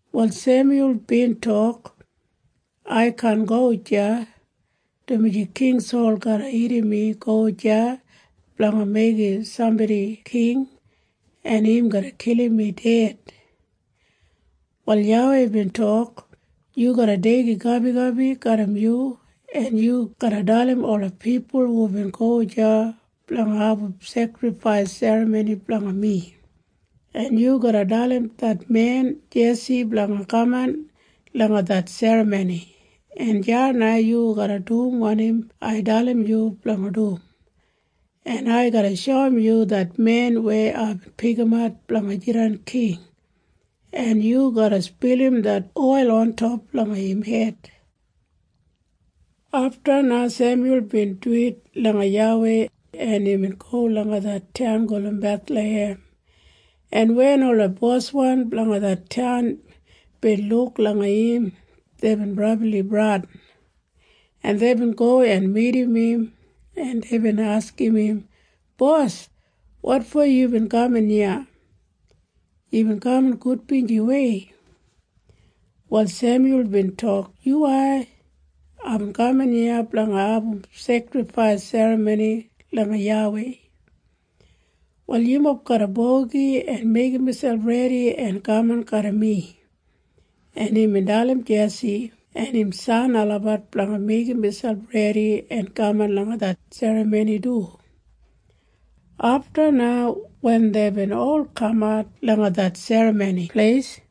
Wal Semyul bin tok, “Ai kaan go deya, dumaji King Sol garra irrim mi go deya blanga meigim sambodi king, en im garra kilim mi ded.” Wal YAWEI bin tok, “Yu garra deigim gabigabi garram yu, en yu garra dalim ola pipul yubin go deya blanga abum sekrifais serramoni blanga mi, en yu garra dalim det men Jesi blanga kaman langa det serramoni, en deya na yu garra dum wanim ai dalim yu blanga dum, en ai garra shoum yu det men weya aibin pikimat blanga jidan king, en yu garra spilim det oil ontop langa im hed.” Afta na Semyul bin duwit langa YAWEI, en imbin go langa det taun gulum Bethlahem, en wen ola boswan blanga det taun bin luk langa im, deibin brabli bradin, en deibin go en midim im, en deibin askim im, “Bos, wotfo yubin kaman iya? Yubin kaman gudbinjiwei?” Wal Semyul bin tok, “Yuwai. Aibin kaman iya blanga abum sekrifais serramoni langa YAWEI. Wal yumob garra bogi en meigim miselp redi en kaman garram mi.” En imbin dalim Jesi en im san olabat blanga meigim miselp redi en kaman langa det serramoni du. Afta na wen deibin ol kamat langa det serramoni pleis,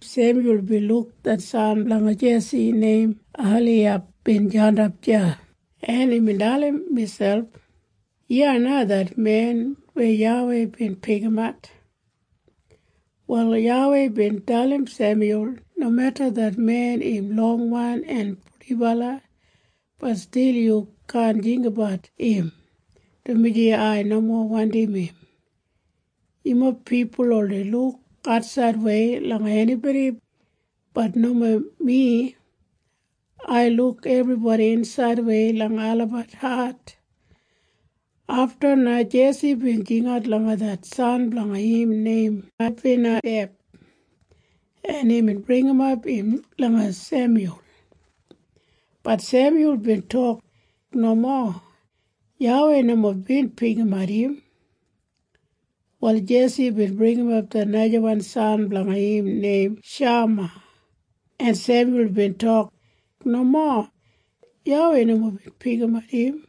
Semyul bin luk det san blanga Jesi neim Eliyab bin jandap deya, en imbin dalim miselp, “Iya na det men weya YAWEI bin pikimat.” Wal YAWEI bin dalim Semyul, “Nomeda det men im longwan en purdibala, bat stil yu kaan jinggabat im, dumaji ai nomo wandim im. Yumob pipul oldei luk atsaidwei langa enibodi. Bat nomo mi. Ai luk ebribodi insaidwei langa olabat hat.” Afta na Jesi bin jingat langa det san blanga im neim Abinadeb, en imbin bringimap im langa Semyul. Bat Semyul bin tok, “Nomo. YAWEI nomo bin pikimat im.” Wal Jesi bin bringimap det najawan san blanga im neim Shama, en Semyul bin tok, “Nomo. YAWEI nomo bin pikimat im.”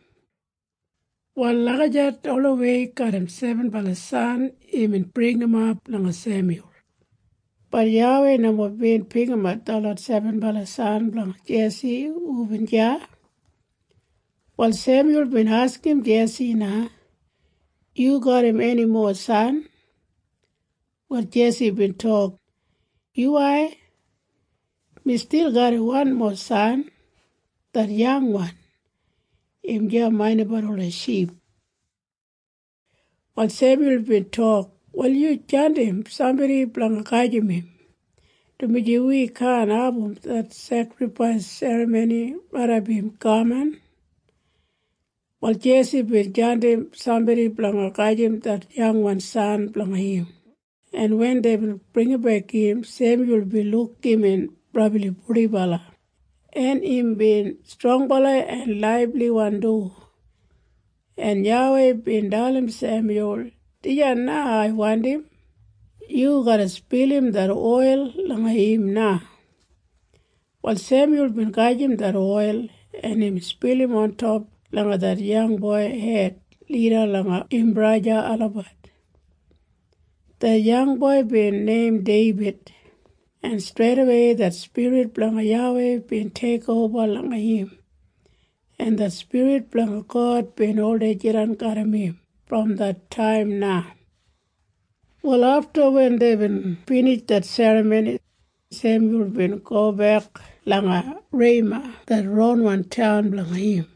Wal lagijat olawei garram sebenbala san imbin bringimap langa Semyul. Bat YAWEI nomo bin pikimat detlot sebenbala san blanga Jesi hubin deya. Wal Semyul bin askim Jesi na, “Yu garram eni mowa san?” Wal Jesi bin tok, “Yuwai. Mi stil garram wanmo san. Det yangwan. Im deya maindimbat ola ship.” Wal Semyul bin tok, “Wal yu jandim sambodi blanga gajim im, dumaji wi kaan abum det sekrifais serramoni raidap im kaman.” Wal Jesi bin jandim sambodi blanga gajim det yangwan san blanga im, en wen deibin bringimbek im, Semyul bin luk imbin brabli purdibala, en imbin strongbala en laibliwan du, en YAWEI bin dalim Semyul, “Dijan na ai wandim. Yu garra spilim det oil langa im na.” Wal Semyul bin gajim det oil, en imbin spilim ontop langa det yangboi hed lida langa im braja olabat. Det yangboi bin neim Deibid, en streidawei det Spirit blanga YAWEI bin teikoba langa im, en det Spirit blanga God bin oldei jidan garram im brom det taim na. Wal afta wen deibin binij det serramoni, Semyul bin gobek langa Rema det ronwan taun blanga im.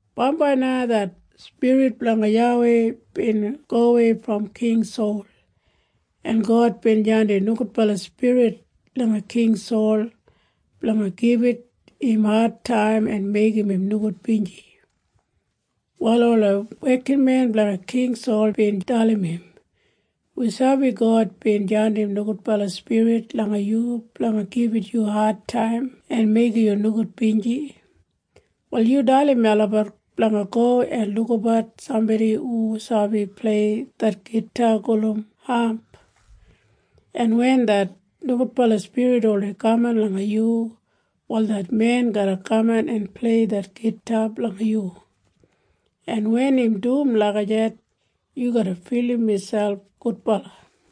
Bambai na det Spirit blanga YAWEI bin gowei brom King Sol, en God bin jandim nogudbala spirit langa King Sol blanga gibit im adtaim en meigim im nogudbinji. Wal ola wekinmen blanga King Sol bin dalim im, “Wi sabi God bin jandim nogudbala spirit langa yu blanga gibit yu adtaim en meigim yu nogudbinji. Wal yu dalim melabat blanga go en lukabat sambodi hu sabi plei det gita gulum hap, en wen det nogudbala spirit oldei kaman langa yu, wal det men garra kaman en plei det gita blanga yu, en wen im dum lagijat, yu garra filim miselp gudbala.”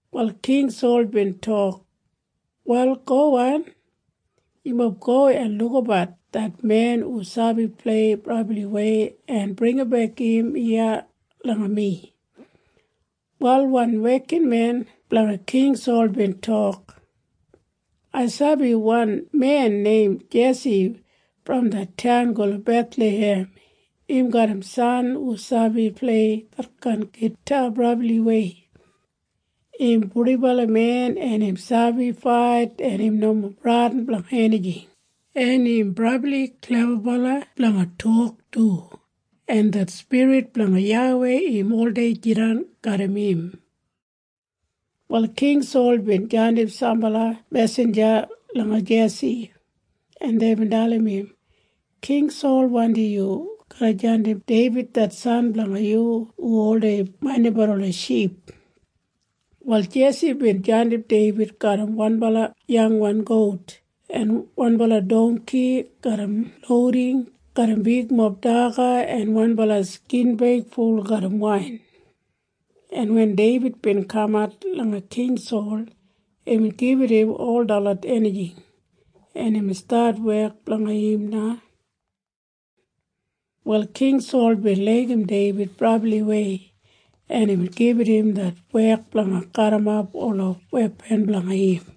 Wal King Sol bin tok, “Wal gowan. Yumob go en lukabat det men hu sabi plei brabliwei en bringimbek im iya langa mi.” Wal wan wekinmen blanga King Sol bin tok, “Ai sabi wan men neim Jesi brom det taun gulum Bethlahem. Im garram san hu sabi plei detkain gita brabliwei. Im purdibala men, en im sabi fait en im nomo bradin blanga enijing, en im brabli klebabala blanga tok du, en det spirit blanga YAWEI im oldei jidan garram im.” Wal King Sol bin jandim sambala mesinja langa Jesi, en deibin dalim im, “King Sol wandim yu garra jandim Deibid det san blanga yu hu oldei maindimbat ola ship.” Wal Jesi bin jandim Deibid garram wanbala yangwan gout en wanbala dongki garram louding garram bigmob daga en wanbala skinbeig ful garram wain, en wen Deibid bin kamat langa King Sol, imbin gibit im ol detlot enijing, en imbin stat wek blanga im na. Wal King Sol bin laigim Deibid brabliwei, en imbin gibit im det wek blanga garrimap ola wepan blanga im.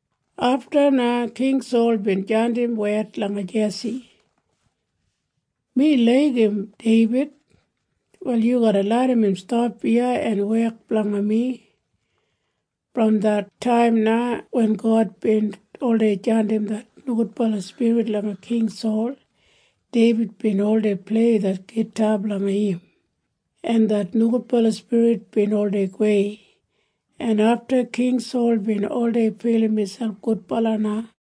Afta na King Sol bin jandim wed langa Jesi, “Mi laigim Deibid. Wal yu garra larram im stap iya en wek blanga mi.” Brom det taim na wen God bin oldei jandim det nogudbala spirit langa King Sol, Deibid bin oldei plei det gita blanga im, en det nogudbala spirit bin oldei gowei, en afta King Sol bin oldei filim miselp gudbala na.